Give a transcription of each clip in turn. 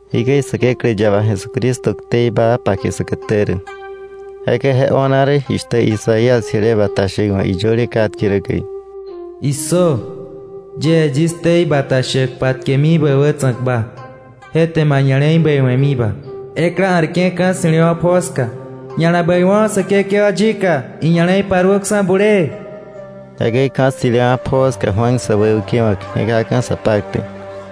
Jikäi Säkeklä yaba Jesucristo ktei baa pake säkätä rä. Jekäi je o̱na rä jishtä Isaías jile bata shäk wa̱ iyöle katke rä käi: “¡Issö! Yie yis ktei bata shäk patkemi bä wätsa̱kba, je te ma ña̱le̱i bäiwe̱miba. Ekla a̱rke̱ ka̱ ssi̱lewa̱ pjoo ska: ‘Ña̱la bäiwo̱ Säkekewa yika, iña̱le̱i paruöksa̱ bulee.” Jekäi ka̱ ssi̱lewa̱ pjoo ska Juan säwäukewa̱k je̱kaka̱ sa paktäk,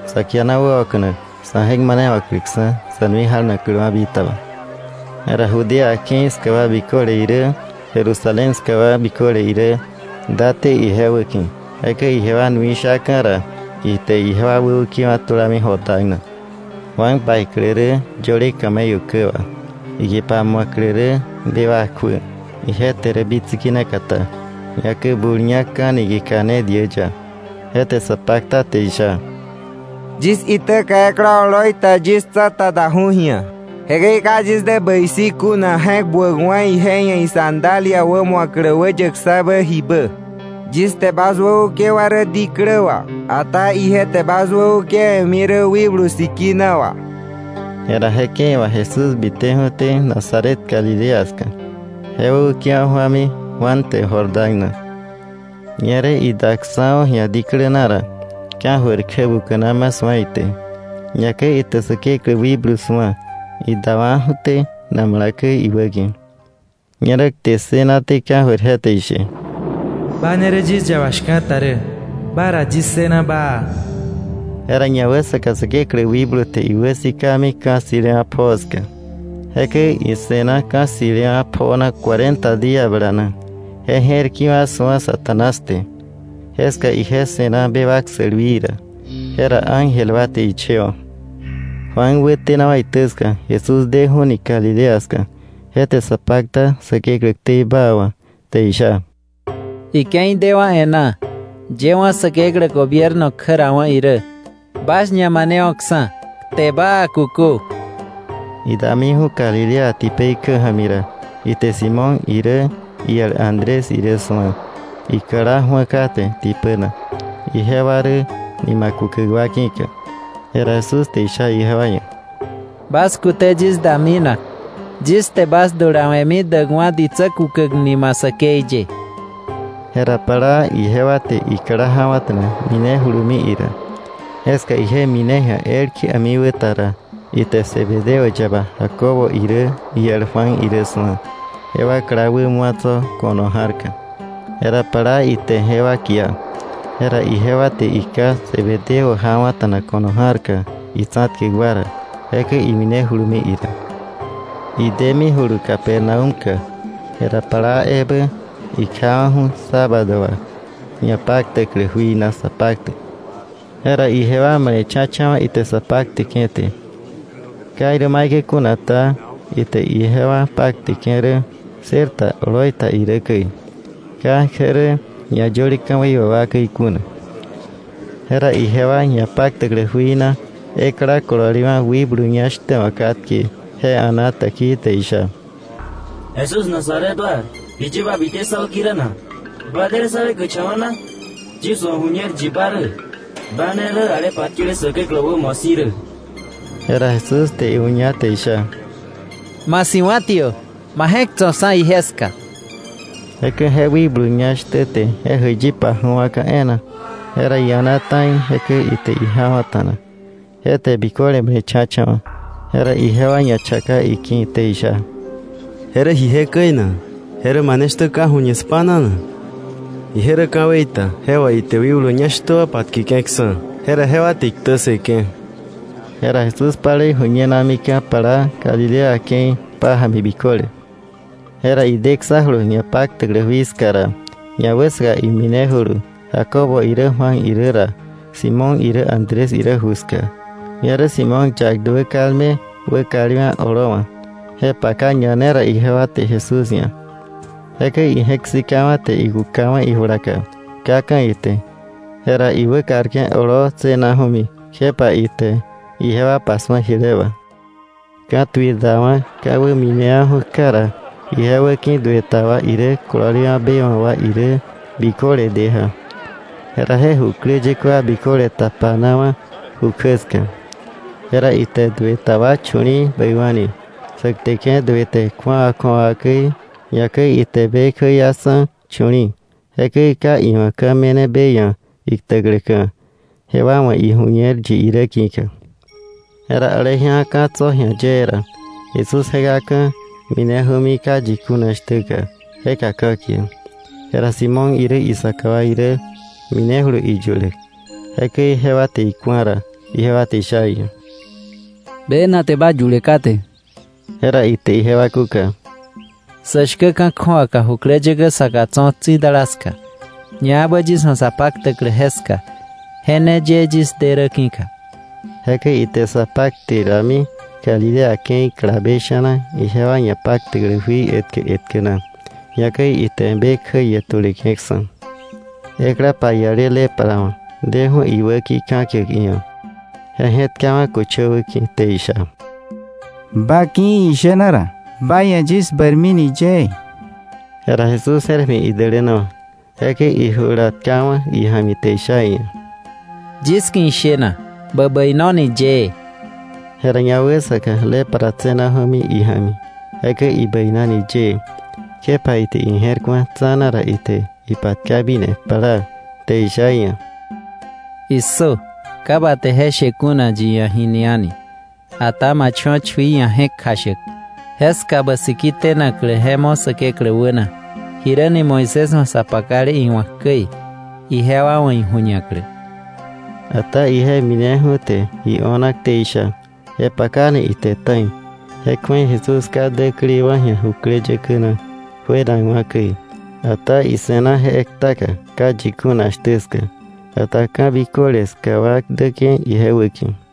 sa kiana wäoka̱nak sa̱ je̱k manewa̱kläksa̱, sa̱ nui janakläwa̱ bitaba. Jera Judea ke̱i ska wa biköle irä, Jerusalén ska wa biköle irä, date ije wäki̱. Jekäi ijewa nui shaka̱ ra, ite ijewa wäukewa̱ tulami Jordán na. Juan paiklä rä yöle camello kä wà, ikipa mu̱aklä rä bewak kjuä. Ije te rä bitsiki ne katá, ñakäi bul ñá ka̱ niki̱ka ne diä ya. Je te sa pakta te isha: “Yis itäka ekla oloi ta yis tsa̱ta daju̱ ji̱a. Jekäi ka yis dä bäi si̱ kuna je̱k buäkwa̱ ije ia̱ isandalia wämu̱aklä wäyäkksa̱bä jibä. Yis te bas wäukewa̱ rä diklä wà, ata ije te bas wäukewe̱mi rä Wikblu Sikina wà.” Jera je ke̱i wà Jesús biteju̱té Nazaret Galilea ska. Je wäukewa̱ ju̱ami Juan te Jordán na. Ñerä idaksa̱ju̱ ji̱a diklä na ra, ka̱jöir kjä buka̱naju̱ma su̱a ite, ñakäi ite Säkeklä wikblu su̱a idawa̱ju̱té namala käi iwäki̱. Ñerä kte ssënaté ka̱jöir je te ishe: “Ba ne rä yis yaba shka̱ta rä, ba ra yis ssëna baa.” Jera ñawäsaka Säkeklä wikblu te iwäsikami ka̱ ssi̱lewa̱ pjoo ska. Jekäi ise̱na ka̱ ssi̱lewa̱ pjoo na cuarenta día bala na, je je̱r kiwa̱ su̱a Satanás te. Jeska ije se̱na bewak sälwii ra, jera ángel wa te ichewa̱. Juan wätenawa̱ itä ska, Jesús deju̱ni Galilea ska. Je te sa pakta Säkeklä ktei baa wà, te isha: “Ike̱i dewa̱ e̱ná. Yëwa̱ Säkeklä gobierno kjärawa̱ irä. Bas ñamanewo̱ksa̱, kte baa kukö.” Idamiju̱ Galilea tipei kjä ja̱mi ra, ite Simón irä iel Andrés irä su̱a, ikla ju̱a kate tipä na, ijewa rä nima kukäk wa ki̱ka. Jera Jesús te isha ijewa ia̱: —Bas kute yis da minak. Yis te bas dulawe̱mi däkwa̱ ditsä kukäk nima säkei ye. Jera plaa ijewa te ikla jawa̱ta̱na minejulumi ira. Jeska ije mine ji̱a elkje a̱mikwäta ra, ite Zebedeo yaba Jacobo irä iel Juan irä su̱a, jewa kla wä mu̱a tso̱ ko̱no ja̱rka. Jera plaa ite jewa kia; jera ijewa te iká Zebedeo jawa̱ta̱na ko̱no ja̱rka itsa̱tkäk wa ra, jekäi iminejulumi ira. Idemijulu Capernaúmka. Jera plaa ebä ikjawa̱ju̱ sábado wà ñapaktäklä jui na sa paktäk. Jera ijewa male̱cha̱cha̱wa̱ ite sa pakteke̱ te. Ka irä maikäi kuna ta, ite ijewa pakteke̱ rä ssër ta oloi ta irä käi, ka je rä ñayöle ka̱wei wà wa käi kuna. Jera ijewa ñapaktäklä jui na ekla kololewa̱ wikblu ñá shtä wa̱ katke, je a̱na täkii, te isha: —Jesús Nazaret wa, ¿jiye ba bite sá wäki̱ rä na? ¿Ba de rä sá weikäkcha̱wa̱ na? Yis wa̱ iju̱ñer yi ba rä; ba ne rä ale patkele Säkeklä wa̱ wämo si̱ rä. Jera Jesús te iuña, te isha: —¡Ma si̱wa̱tiö, ma je̱k tso̱ksa̱ ije ska! Jekäi je wikblu ñá shtä te je jäiyi paju̱wa̱ka̱ e̱e̱na. Jera ia̱na ta̱i, jekäi ite ijawa̱ta̱na. Je te biköle male̱cha̱cha̱wa̱, jera ijewa ñachaka iki̱, te isha: —¿Je rä ji jekäi na? ¿Je rä mane shtä ka̱ju̱ñe spa̱na na? Ije rä ka̱wei ta je wà ite wikblu ñá shtä wa patkeke̱ksa̱, jera jewa te iktä ssëke̱. Jera Jesús palei ju̱ñenamika̱ plaa Galilea ke̱i pája̱mi biköle. Jera ideksa̱julu ñapaktäklä jui ska ra, ñawäsaka iminejulu Jacobo irä Juan irä ra, Simón irä Andrés irä juka. Ñerä Simón yak duä kalme wäkalewa̱ oloowa̱, je paka ñane ra ijewa te Jesús ia̱. Jekäi ije̱k sikawa̱ te ikukawa̱ ijulaka, kaka̱ ite. Jera iwäkarke̱ oloo tse̱naju̱mi, kjepa ite ijewa pasu̱a jile wà. Ka̱tuir dawa̱, ka̱wä minewa̱ju̱ kja ra, ije wäki̱ duë ta wa irä kololewa̱ be wa̱ wa irä biköle de ja. Jera je jukläyäkä wa biköle tapanawa̱ ju kjä ska. Jera ite duë ta wa chu̱li̱i̱ bäiwa̱ni, sä kteke̱ duë te kju̱awa kju̱awa käi, ñakäi ite be kjäiaksa̱ chu̱li̱i̱. Jekäi ka iwa̱ ka̱ me̱ne be ia̱ iktäkläka̱, jewa wa̱ iju̱ñer yi irä ki̱ka. Jera aleji̱a ka̱ tso̱ ji̱a yee ra, Jesús je̱kaka̱ mineju̱mi ka yi kuna shtä ska, jeka ka̱kiäk. Jera Simón irä isaka wa irä minejulu iyuläk. Jekäi jewa te iku̱a ra, ijewa te isha iia̱: —Bena te ba yule kate. Jera ite ijewa kúka: —Sä shkä ka̱ kju̱awaka jukläyäkä saka tso̱ tsi̱dala ska, ñaebä yis wa̱ sa paktäklä jeska, je ne ye yis de rä ki̱ka. Jekäi ite sa pakte rami Galilea ke̱i kalabe sha̱na ijewa ñapaktäklä jui etkä etkä na, ñakäi ite be kjäie tuleke̱ksa̱. Ekla paiale lepra wa̱ deju̱ iwäki̱ ka̱kiäk iia̱, je je̱tkawa̱ köchöwä ki̱, te isha: —Ba ki̱ ishena ra, ba ia̱ yis bäirmini yëë. Jera Jesús je̱r ja̱mi idälänawa̱; jekäi ijula tkawa̱ ija̱mi te isha iia̱: —Yis ki̱ ishena; bä bäinoni yëë. Jera ñawäsaka lepra tse̱naju̱nami ija̱mi, jekäi ibäinani yëë. Kjepa ite ije̱r ku̱a tsa̱na ra, ite ipatkamine plaa te isha iia̱: —¡Issö! Ka bä te je she kuna yi ia̱ jini a̱ni, ata ma cho̱ chui ia̱ je̱k kjashäk. Jeska bä siki tenaklä je mo̱ Säkeklä wäna, jiräni Moisés wa̱ sa pakale iwa̱k käi, ijewa wa̱ iju̱ñaklä. Ata ije mineju̱ te ji o̱na ktei sha, je pakani ite ta̱i. Je kju̱ei Jesús ka däkleiwa̱ ji̱a jukläyäkä na juenakwa̱ käi, ata ise̱na je ektaka ka yi kuna shtä ska. Ata ka̱ biköle ska wa däke̱ ije wäki̱.